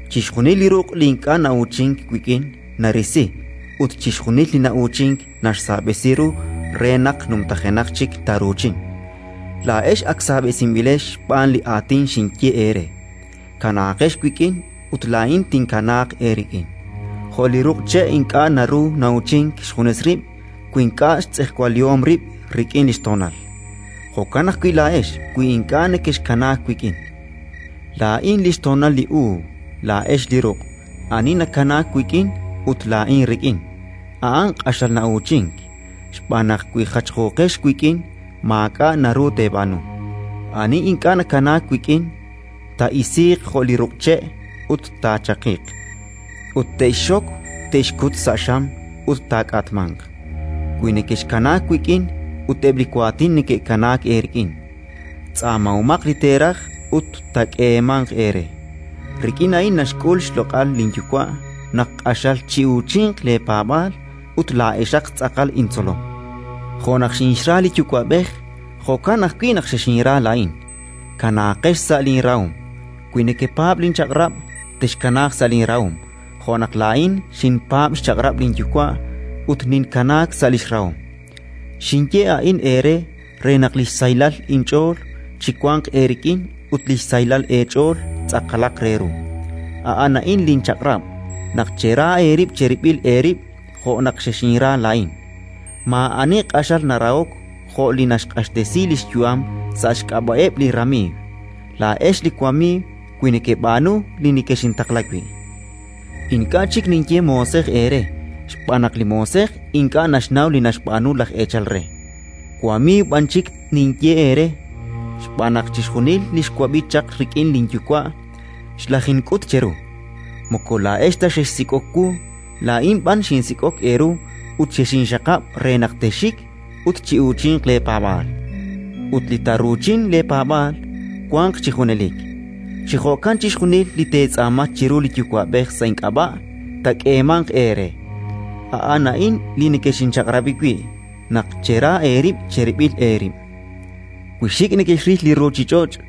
Chixjunil li ruq' li ink'a' na'uuchink wik'in, narisi; ut chixjunil li na'uuchink, naxsaab'esi ru re naq numtajenaq chik taaruuchin. Laa'ex ak saab'esinb'ilex xb'aan li aatin xinye eere. Kanaaqex wik'in, ut laa'in tinkanaaq eerik'in. Jo' li ruq' che' ink'a' naru na'uuchink xjunes rib' wi ink'a' xtz'ejwalihom rib' rik'in li xtoonal, jo'kan ajwi' laa'ex wi ink'a' nekexkanaak wik'in. “Laa'in li xtoonal li uub'; laa'ex li ruq'. Ani nakanaak wik'in ut laa'in rik'in, a'an q'axal na'uuchink, xb'aan naq wi jachjooqex wik'in maak'a' naru teeb'aanu. Ani ink'a' nakanaak wik'in taa'isiiq jo' li ruq' che', ut taachaqiq. Ut te'xxok, te'xkut sa' xam ut taak'atmanq. “Wi nekexkanaak wik'in ut eb' li waatin neke'kanaak eerik'in, tz'aamahomaq li teeraj ut taak'eemanq eere. Rik'in a'in naxk'ul xloq'al linYuwa', naq q'axal chi'uuchinq leepaab'aal ut laa'exaq tz'aqal intzolom. Jo' naq xinxra li Yuwa'b'ej, jo'kan ajwi' naq xexinra laa'in. Kanaaqex sa' linrahom. Wi nekepaab' linchaq'rab', texkanaaq sa' linrahom jo' naq laa'in xinpaab' xchaq'rab' linYuwa' ut ninkanaak sa' li xrahom. “Xinye a'in eere re naq li xsahilal inch'ool chiwanq eerik'in ut li xsahilal eech'ool tz'aqalaq re ru. A'an a'in linchaq'rab', naq chera eerib' cherib'il eerib' jo' naq xexinra laa'in. Maa'ani q'axal narahok jo' li naxq'axtesi li xyu'am sa' xk'ab'a'eb' li ramiiw. Laa'ex li wamiiw wi nekeb'aanu li nekexintaqla wi'. Ink'a' chik ninye moosej eere xb'aan naq li moosej ink'a' naxnaw li naxb'aanu laj eechal re; wamiiw b'an chik ninye eere xb'aan naq chixjunil li xwab'i chaq rik'in linYuwa', xlajink'ut cheru. “Moko laa'ex ta xexsik'ok wu; laa'in b'an xinsik'ok eeru ut xexinxaqab' re texxik ut chi'uuchinq leepaab'aal, ut li taaruuchin leepaab'aal wanq chi junelik. Chi jo'kan chixjunil li teetz'aama chiru li Yuwa'b'ej sa' ink'ab'a', taak'eemanq eere. A'an a'in li nekexinchaq'rab'i wi', naq chera eerib' cherib'il eerib'. Eb' li xtzolom li Jesus ut li ruuchich'och'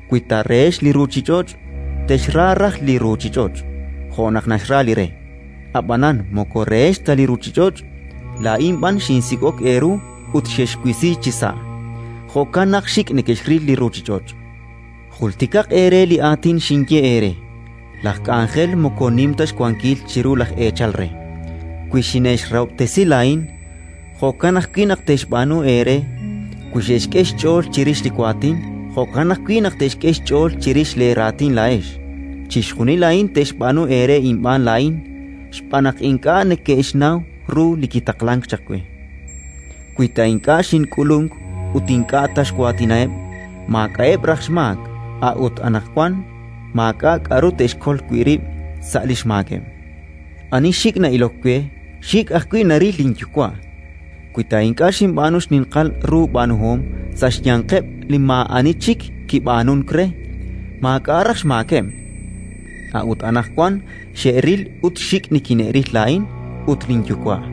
Wi ta rehex li ruuchich'och', texxra raj li ruuchich'och' jo' naq naxra li re. Ab'anan moko rehex ta li ruuchich'och', laa'in b'an xinsik'ok eeru ut xexwisi chisa': jo'kan naq xik' nekexril li ruuchich'och'. Jultikaq eere li aatin xinye eere: «Laj k'anjel moko nim ta xwankil chiru laj eechal re». Wi xine'xrahob'tesi laa'in, jo'kan ajwi' naq texb'aanu eere; wi xe'xk'e xch'ool chirix li waatin, jo'kan ajwi' naq te'xk'e xch'ool chirix leeraatin laa'ex. Chixjunil a'in te'xb'aanu eere inb'aan laa'in, xb'aan naq ink'a' neke'xnaw ru li kitaqlank chaq we. “Wi ta ink'a' xink'ulunk ut ink'a' ta xwaatinaheb', maak'a'eb' raj xmaak; a'ut anaqwan maak'a' k'aru te'xkol wi' rib' sa' li xmaakeb'. Ani xik' na'ilok we, xik' ajwi' naril linYuwa'. Wi ta ink'a' xinb'aanu li xninqal ru b'aanuhom sa' xyanqeb' li maa'ani chik kib'aanunk re, maak'a' raj xmaakeb'; a'ut anaqwan xe'ril ut xik' nikine'ril laa'in ut linYuwa'.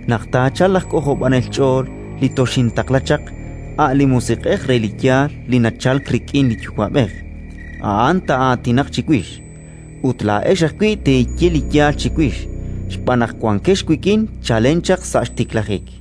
“Naq taachalq laj K'ojob'anel ch'ool li toxintaqla chaq, a' li Musiq'ej re li yaal li nachalk rik'in li Yuwa'b'ej, a'an taa'aatinaq chiwix. Ut laa'ex ajwi' teeye li yaal chiwix, xb'aan naq wankex wik'in chalen chaq sa' xtiklajik.